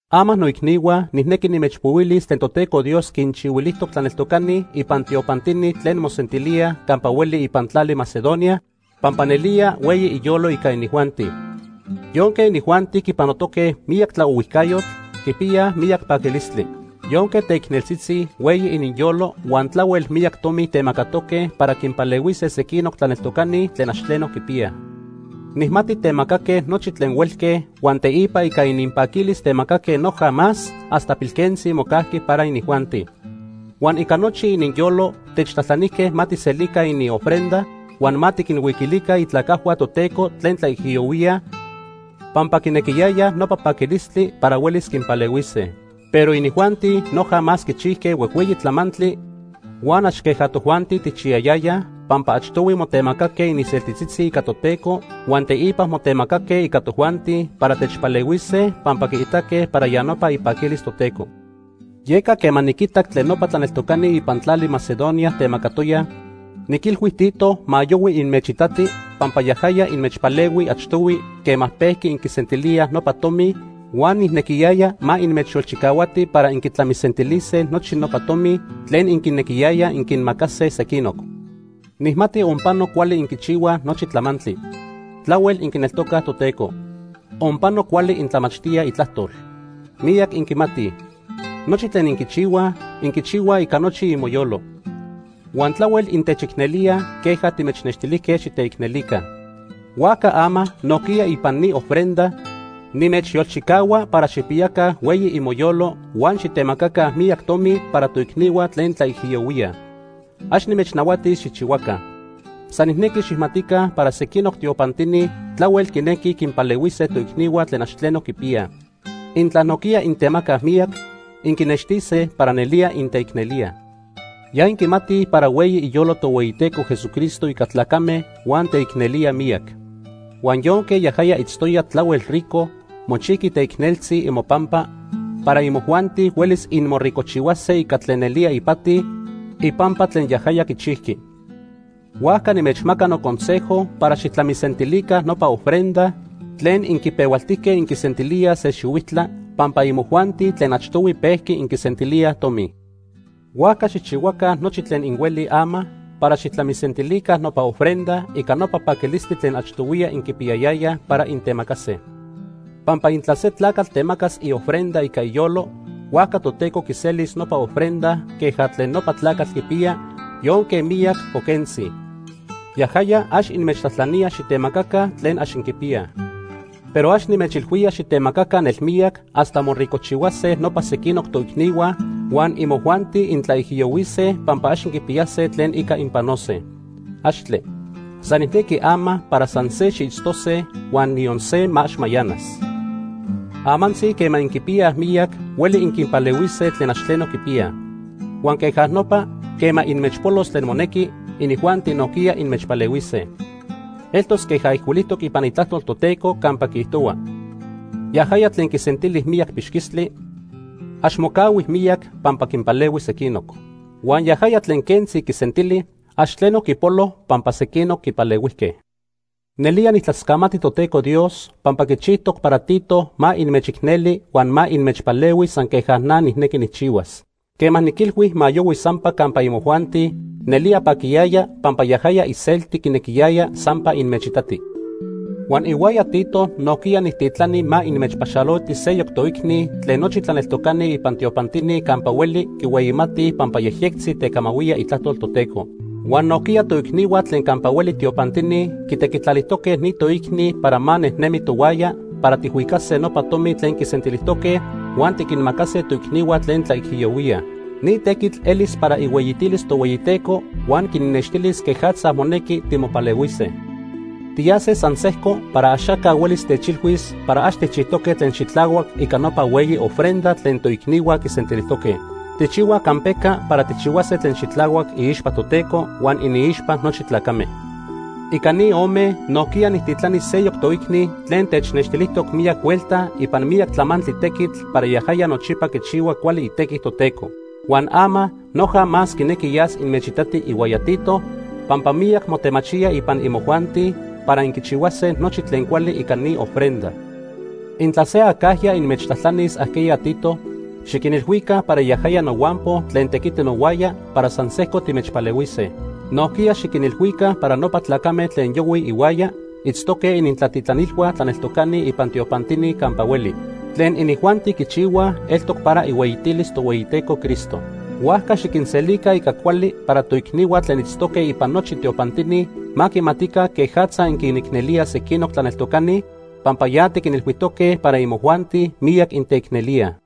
Ama noicnihua nijnequi nimechpohuilis tlen Toteco Dios quinchihuilijtoc tlaneltocani ipan tiopantini tlen mosentilíaj campa hueli ipan tlali Macedonia, pampa nelía hueyi iyolo ica inijuanti. Yonque inijuanti quipanotoque miyac tlaohuijcayotl, quipiyaj miyac paquilistli. Yonque teicneltzitzi, hueyi ininyolo huan tlahuel miyac tomi temacatoque para quinpalehuise sequinoc tlaneltocani tlen ax tleno quipiyaj. Nijmati temacaque nochi tlen huelque huan teipa ica ininpaquilis temacaque noja más hasta pilquentzi mocajqui para inijuanti. Huan ica nochi ininyolo techtlajtlanijque ma tijselica iniofrenda huan ma tiquinhuiquilica itlacajhua Toteco tlen tlaijiyohuíaj pampa quinequiyayaj nopa paquilistli para huelis quinpalehuise. Pero inijuanti noja más quichijque huejhueyi tlamantli huan ax queja tojuanti tijchiyayayaj, pampa achtohui motemacaque ininseltitzitzi ica Toteco huan teipa motemacaque ica tojuanti para techpalehuise pampa quiitaque para ya nopa ipaquilis Toteco. Yeca quema niquitac tlen nopa tlaneltocani ipan tlali Macedonia temacatoyaj, niquilhui Tito ma yohui inmechitati, pampa yajaya inmechpalehui achtohui quema pejqui inquisentilíaj nopa tomi huan nijnequiyaya ma inmechyolchicahuati para inquitlamisentilise nochi nopa tomi tlen inquinequiyayaj inquinmacase sequinoc. Nijmati onpano cuali inquichihuaj nochi tlamantli. Tlahuel inquineltocaj Toteco. Onpano cuali intlamachtíaj Itlajtol. Miyac inquimatij. Nochi tlen inquichihuaj, inquichihuaj ica nochi imoyolo. Huan tlahuel intechicnelíaj queja timechnextilijque xiteicnelica. Huajca ama nojquiya ipan ni ofrenda, nimechyolchicahua para xijpiyaca hueyi imoyolo huan xitemacaca miyac tomi para toicnihua tlen tlaijiyohuíaj. Ax nimechnahuatis xijchihuaca. San nijnequi xijmatica para sequinoc tiopantini tlahuel quinequij quinpalehuise toicnihua tlen ax tleno quipiyaj. Intla nojquiya intemacaj miyac, inquinextise para nelía inteicnelíaj. Ya inquimatij para hueyi iyolo Tohueyiteco Jesucristo ica tlacame huan teicnelía miyac. Huan yonque yajaya itztoya tlahuel rico, mochijqui teicneltzi imopampa, para imojuanti huelis inmoricojchihuase ica tlen nelía ipati ipampa tlen yajaya quichijqui. Huajca nimechmaca noconsejo para xijtlamisentilica nopa ofrenda tlen inquipehualtijque inquisentilíaj se xihuijtla, pampa imojuanti tlen achtohui pejqui inquisentilíaj tomi. Huajca xijchihuaca nochi tlen inhuelij ama para xijtlamisentilica nopa ofrenda ica nopa paquilistli tlen achtohuiya inquipiyayayaj para intemacase. Pampa intla se tlacatl temacas iofrenda ica iyolo, huajca Toteco quiselis nopa ofrenda queja tlen nopa tlacatl quipiya, yonque miyac o quentzi. Yajaya ax inmechtlajtlanía xitemacaca tlen ax inquipiyaj. Pero ax nimechilhuía xitemacaca nelmiyac hasta moricojchihuase nopa sequinoc toicnihua huan imojuanti intlaijiyohuise pampa ax inquipiyase tlen ica inpanose. ¡Axtle! San nijnequi ama para san se xiitztose huan niyon se ma ax mayanas. Amantzi quema inquipiyaj miyac, hueli inquinpalehuise tlen ax tleno quipiyaj. Huan queja nopa, quema inmechpolos tlen monequi, inijuanti nojquiya inmechpalehuise. Eltos queja ijcuilijtoc ipan Itlajtol Toteco campa quiijtohua: “Yajaya tlen quisentili miyac pixquistli, ax mocahui miyac pampa quinpalehui sequinoc. Huan yajaya tlen quentzi quisentili, ax tleno quipolo pampa sequinoc quipalehuijque.” Nelía nijtlascamati Toteco Dios, pampa quichijtoc para Tito ma inmechicneli huan ma inmechpalehui san se queja na nijnequi nijchihuas. Quema niquilhui ma yohui sampa campa imojuanti, nelía paquiyaya pampa yajaya iselti quinequiyaya sampa inmechitati. Huan ihuaya Tito nojquiya nijtitlani ma inmechpaxaloti seyoc toicni tlen nochi tlaneltocani ipan tiopantini campa hueli quihueyimatij pampa yejyectzi tecamahuía Itlajtol Toteco. Huan nojquiya toicnihua tlen campa hueli tiopantini quitequitlalijtoque ni toicni para ma nejnemi tohuaya para tijhuicase nopa tomi tlen quisentilijtoque huan tiquinmacase toicnihua tlen tlaijiyohuíaj. Ni tequitl elis para ihueyitilis Tohueyiteco huan quinnextilis quejatza monequi timopalehuise. Tiyase san sejco para axaca huelis techteilhuis para ax tijchijtoque tlen xitlahuac ica nopa hueyi ofrenda tlen toicnihua quisentilijtoque. Tijchihuaj campeca para tijchihuase tlen xitlahuac iixpa Toteco huan iniixpa nochi tlacame. Ica ni ome nojquiya nijtitlani seyoc toicni tlen technextilijtoc miyac huelta ipan miyac tlamantli tequitl para yaja nochipa quichihua cuali itequi Toteco. Huan ama noja más quinequi yas inmechitati ihuaya Tito pampa miyac motemachía ipan imojuanti para inquichihuase nochi tlen cuali ica ni ofrenda. Intla se acajya inmechtlajtlanis ajqueya Tito, xiquinilhuica para yajaya nohuampo tlen tequiti nohuaya para san sejco timechpalehuise. Nojquiya xiquinilhuica para nopa tlacame tlen yohuij ihuaya itztoque inintlatitlanilhua tlaneltocani ipan tiopantini campa hueli. Tlen inijuanti quichihuaj eltoc para ihueyitilis Tohueyiteco Cristo. Huajca xiquinselica ica cuali para toicnihua tlen itztoque ipan nochi tiopantini ma quimatica quejatza inquinicnelíaj sequinoc tlaneltocani, pampa ya tiquinilhuijtoque para imojuanti miyac inteicnelíaj.